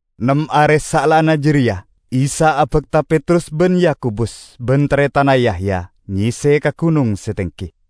Nem are saellana jareya Isa abakta Petrus ban Yakobus ban taretanna, Yahya, nyese ka gunong se tenggi.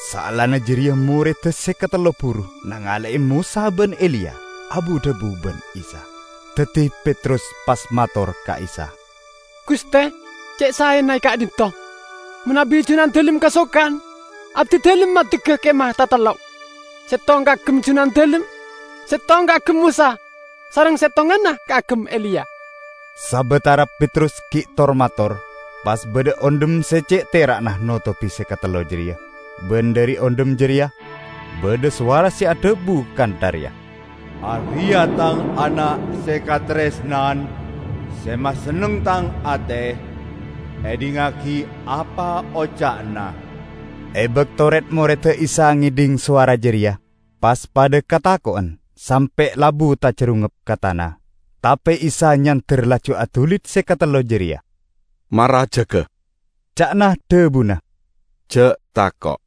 Saellana jareya morreda se katello buru nangale'e Mosa ban Eliya abu-dhabu ban Isa. Daddi Petrus pas mator ka Isa, "Guste, ce' saena e ka'dhinto'. Manabi Junandalem kasokan, abdidalem maddegga kemah tatello': settong kaagem Junandalem, settong kaagem Mosa, sareng settonganna kaagem Eliya." Sabatara Petrus gi' tor-mator, pas badha ondhem se ce' tera'na notobi se katello jareya ban dhari ondhem jareya badha sowara se adhabu kantha reya, "Areya' Tang Ana' se kataresnan, se masenneng Tang ate. Edhingngagi apa oca'na." E bakto red-morreda Isa ngedhing sowara jareya pas padha katako'en sampe' labu tajarungngep ka tana. Tape Isa nyander laju adulit se katello jareya. "Mara jaga," ca'na dhabuna, "ja' tako'!"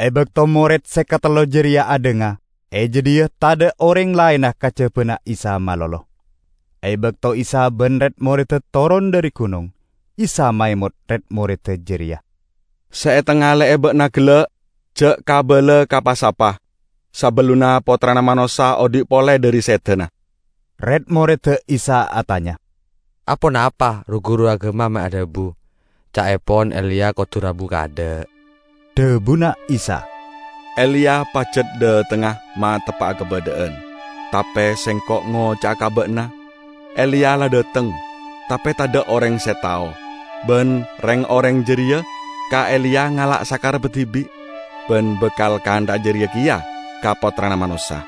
E bakto mored se katello jareya adhanga, e jadhiya tadha' oreng laenna kajabana Isa malolo. E bakto Isa ban red-moredda toron dhari gunong, Isa maemot red-moredda jareya, "Se etangale'e ba'na gella' ja' kabala ka pa-sapa, sabellunna Pottrana Manossa odhi' pole dhari sedana." Red-moredda Isa atanya, "Aponapa ru-guru agama me' adhabu ca'epon Eliya kodu rabu kaadha'?" Dhabuna Isa, "Eliya pajat dhatengnga mateppa'a kabadha'an. Tape Sengko' ngoca'a ka ba'na, Eliya la dhateng, tape tadha' oreng se tao; ban reng-oreng jareya ka Eliya ngala' sakarebba dibi'. Ban bakal kantha'a jareya keya ka Pottrana Manossa."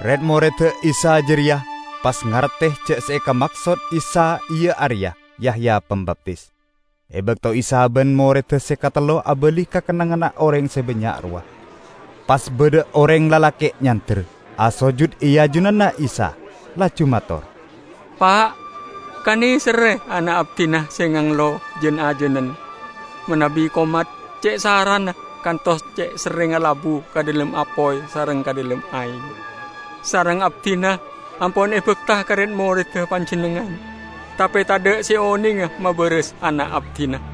Red-moredda Isa jareya pas ngarte ja' se ekamaksod Isa iya areya Yahya Pambaptis. E bakto Isa ban moredda se katello abali ka kennengnganna oreng se bannya' rowa, pas badha oreng lalake' nyander, asojud e ajunanna Isa, laju mator, "Pa', kaneserre ana' abdina se nganglo jan-ajanen. Manabi komat ce' sarana kantos ce' serrengnga labu ka dhalem apoy sareng ka dhalem aeng. Sareng abdina ampon e bakta ka red-moredda Panjennengngan, tape tadha' se onenga mabaras ana' abdina."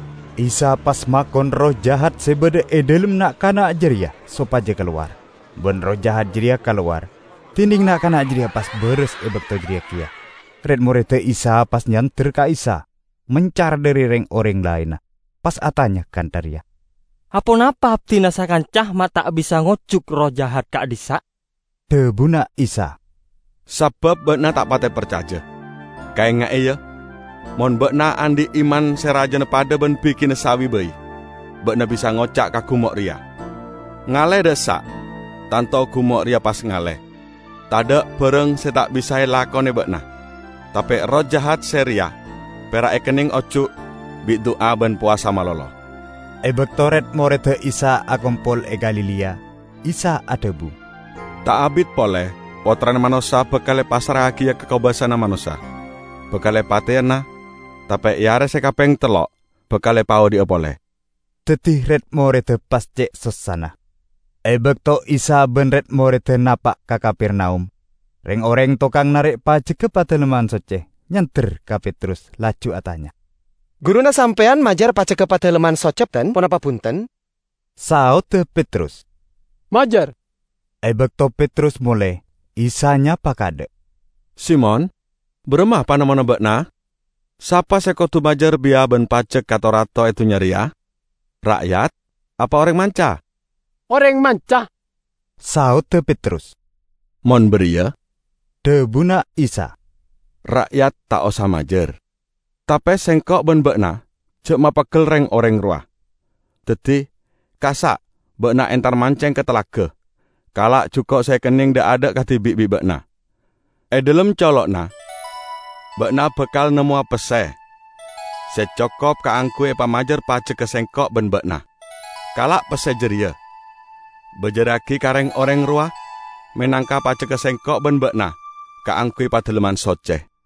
Isa pas makon erroh jahat se badha e dhalem na'-kana' jareya sopaja kalowar. Ban erroh jahat jareya kalowar, dineng na'-kana' jareya pas baras e bakto jareya keya. Red-moredda Isa pas nyander ka Isa mencar dhari reng-oreng laenna, pas atanya kantha reya, "Aponapa abdina sakanca ma' ta' bisa ngojuk erroh jahat ka'dhissa'?" Dhabuna Isa, "Sabab ba'na ta' pate parcaja. Kaenga'e, ya! Mon ba'na andhi' iman se rajana padha ban bigina sawi bai, ba'na bisa ngoca' ka gumo' reya, 'Ngalle dha' essa'!' tanto gumo' reya pas ngalle. Tadha' barang se ta' bisa elakone ba'na! [ Tape erroh jahat se reya pera' ekenneng ojuk bi' du'a ban powasa malolo.]" E bakto red-moredda Isa akompol e Galilea, Isa adhabu, "Ta' abit pole Pottrana Manossa bakal epassra'agiya ka kobasana manossa, bakal epateyana, tape e are se kapeng tello' bakal epaodhi'a pole." Daddi red-moredda pas ce' sossana. E bakto Isa ban red-moredda napa' ka Kapernaum, reng-oreng tokang narek pajegga Padalemman Socce nyander ka Petrus laju atanya, "Guruna sampeyan majar pajegga Padalemman Socce ponapa bunten?" Saodda Petrus, "Majar!" E bakto Petrus mole, Isa nyapa kaadha', "Simon, baramma panemmona ba'na? Sapa se kodu majar biya ban pajek ka to-rato e dunnya reya? Ra'yat apa oreng manca?" "Oreng manca," saodda Petrus. "Mon bariya," dhabuna Isa, "ra'yat ta' osa majar. Tape Sengko' ban ba'na ja' mapeggel reng-oreng rowa. Daddi, kassa' ba'na entar manceng ka talaga. Kala' juko' se ekenneng dha'-adha' kadibi' bi' ba'na. E dhalem colo'na ba'na bakal nemmowa pesse se cokop kaangguy epamajar pajegga Sengko' ban ba'na. Kala' pesse jareya, bajarragi ka reng-oreng rowa menangka pajegga Sengko' ban ba'na kaangguy Padalemman Socce."